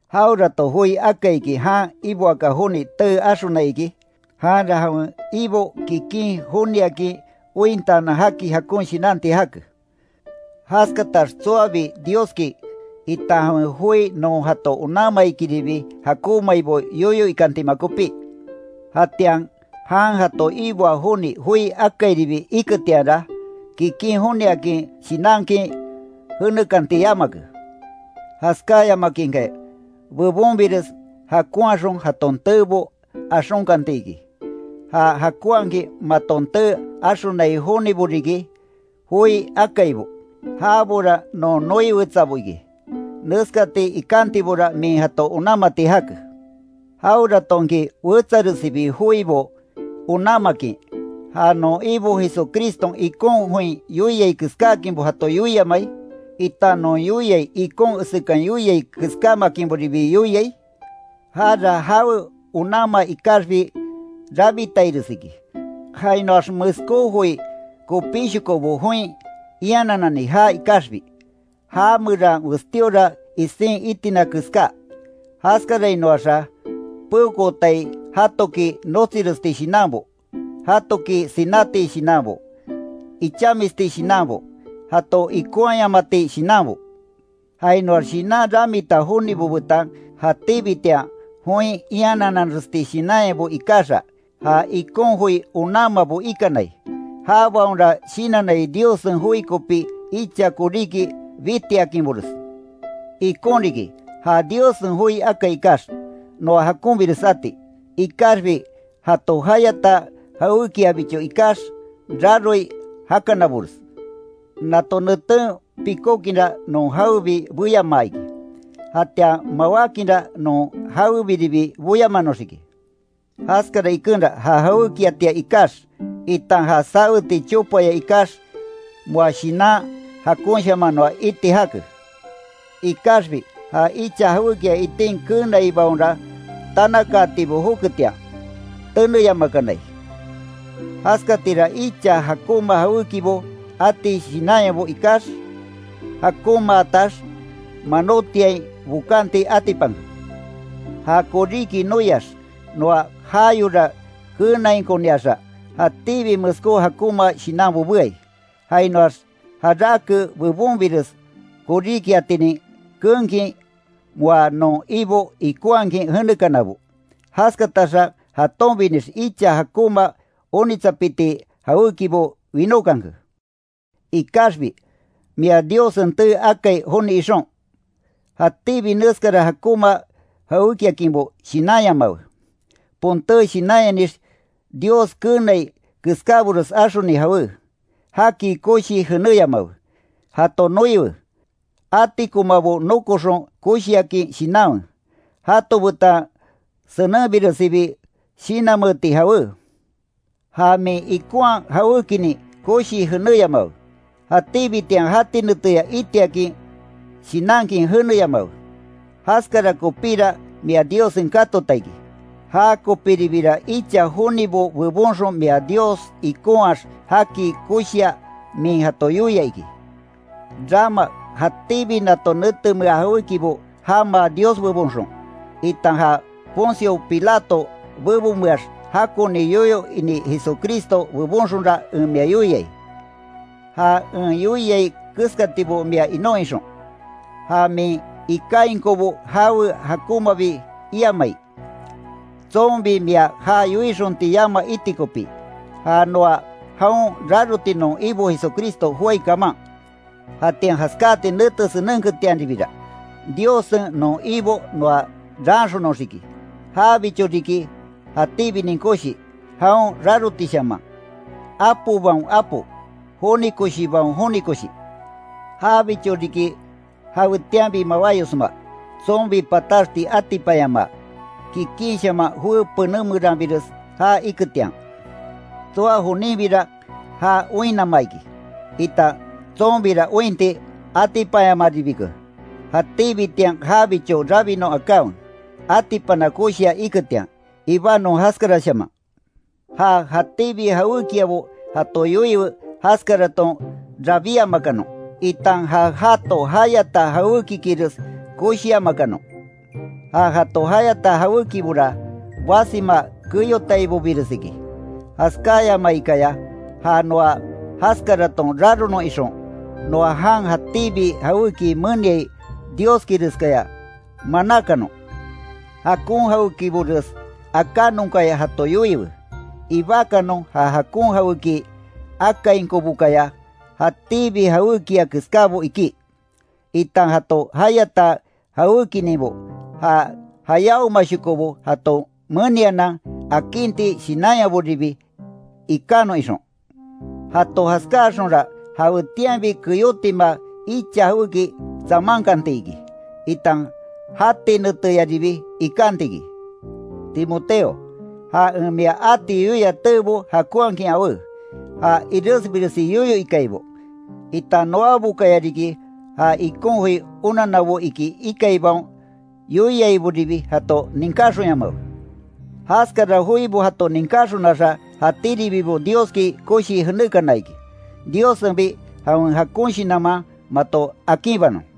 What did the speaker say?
Jawerato joi akaiki jan iboaka joni tee axonai iki, janra jawen ibo kikin joniakin ointaanan jaki jakon shinanti jake. Jaskatax tsoabi Dioski, itan jawen joi non jato onanmaikiribi, jakonmaibo yoyo ikantima kopí. Jatian jan jato iboa joni joi akairibi iketianra, kikin joniakin shinankin jenekanti yamake. Jaskáyamakinkaya, bebonbires jakonhaxon jaton teebo axonkanti iki, ja jakonhakin maton tee axonai jonibo riki joi akaibo, jabora non noi wetsabo iki, neskati ikantibora min jato onanmati jake. Jaweratonki wetsaresibi joibo onanmakin, ja non Ibo Jesucriston ikon join yoiai keskáakinbo jato yoiamai, itan non yoiai ikon esekan yoiai keskámakinboribi yoiai, jara jawe onanma ikaxbi rabitaires iki, jainoax meskó joi kopíshokobo join iananani jaa ikaxiki, já meran westíora isin itina keská. Jaskarainoaxa peokootai jatoki notsiresti shinanbo, jatoki sináti shinanbo, ichamisti shinanbo, jato ikonhayamati shinanbo, jainoax shinan ramita jonibo betan jatíbitian join ianananresti shinanyabo ikaxa, ja ikon joi onanmabo ikanai, jabaonra shinannai Diossen joi kopi icha koríki bitiakinbores. Ikon riki ja Diossen joi akai ikax, noa jakonbires jati. Ikaxbi jato jayata jawékiabicho ikax, raroi jakanabores. Nato neten pikókinra non jawebi beyamaa iki, jatian mawákinra non jawebiribi boyamanoxiki. Jaskara ikenra ja jawékiatia ikax, itan ja saweti chopaya ikax moa shinan jakonshaman noa iti jake. Ikaxbi ja icha jawékia itin keenaibaonra tanakaatibo joketian, teneyamakanai. Jaskatira icha jakonma jawékibo ati shinanyabo ikax, jakonmaatax manótiain bokanti atipanke. Ja koríki noiax noa jayora keenainkoniaxa, jatíbi meskó jakonma shinanbo beai, jainoax jarake bebonbires koríkiatinin keenkin moa non Ibo ikonhakin jenekanabo, jaskataxa jatonbinix icha jakonma onitsapiti jawékibo winókanke. Ikaxbi mia Diossen tee akai joni ixon, jatíbi neskara jakonma jawékiakinbo shinanyamawe, ponté shinanyanix Dios keenai keskábores axoni jawe, jaki koshii jenéyamawe, jato noiwe, atikomabo nokoxon koshiakin shinanwe, jato betan senenbiresibi shinanmeeti jawe. Ja min ikonhaa jawékinin koshii jenéyamawe, jatíbitian jati neteya itiakin shinankin jeneyamawe, jaskara kopíra mia Diossen katota iki, jakopiribira icha jonibo bebonxon mia Dios ikonhaax jaki koshia min jato yoia iki. Rama jatíbi nato netemea jawékibo jamaa Dios bebonxon, itan ja Poncio Pilato bebonmeax jakoni yoyo ini Jesucristo bebonxonra en mia yoiai, ja en yoiai keskatibo mia inon ixon, ja min ikainkonbo jawe jakonmabi iamai, tsonbi mia ja yoixonti yama iti kopí; ja noa jaon raroti non Ibo Jesucristo joái kaman. Jatian jaskati nete senenketianribira, Diossen non Ibo noa raanxonoxiki, jabicho riki jatíbinin koshi, jaon rarotishaman, apobaon Apo, joni koshibaon joni koshi. Jabicho riki jawetianbi mawáyosma, tsonbi pataxti atipanyamaa, kikinshaman joé pené meranbires jaa iketian. Tsoa joninbira ja oinnama iki, itan tsonbira ointi atipanyamaribike, jatíbitian jabicho rabinon akanwe, atipana koshia iketian, ibanon jaskarashaman. Ja jatíbi jawékiabo jato yoiwe jaskaraton rabíamakanon, itan ja jato jayata jawékikires koshiamakanon, ja jato jayata jawékibora basima keyotaibobires iki, jaskayamaikaya ja noa jaskaraton raronon ixon, noa jan jatíbi jawéki meniai Dioskireskaya manákanon. Jakon jawékibores akanonkaya jato yoiwe, ibákanon ja jakon jawéki akainkobokaya jatíbi jawékia keskábo ikí, itan jato jayata jawékininbo ja jayáomashokobo jato menianan akinti shinanyaboribi ikanon ixon. Jato jaskáaxonra jawetianbi keyótima icha jawéki tsamankanti iki, itan jati neteyaribi ikanti iki. Timoteo, ja en mia ati yoia teebo jakonhakin awé, ja iresbiresi yoyo ikaibo, itan noabokaya riki ja ikon joi onanabo iki ikaibaon yoiaiboribi jato ninkáxonyamawe, jaskara joibo jato ninkáxonaxa jatíribibo Dioski koshii jenékana iki. Diossenbi jawen jakon shinanman mato akinbanon.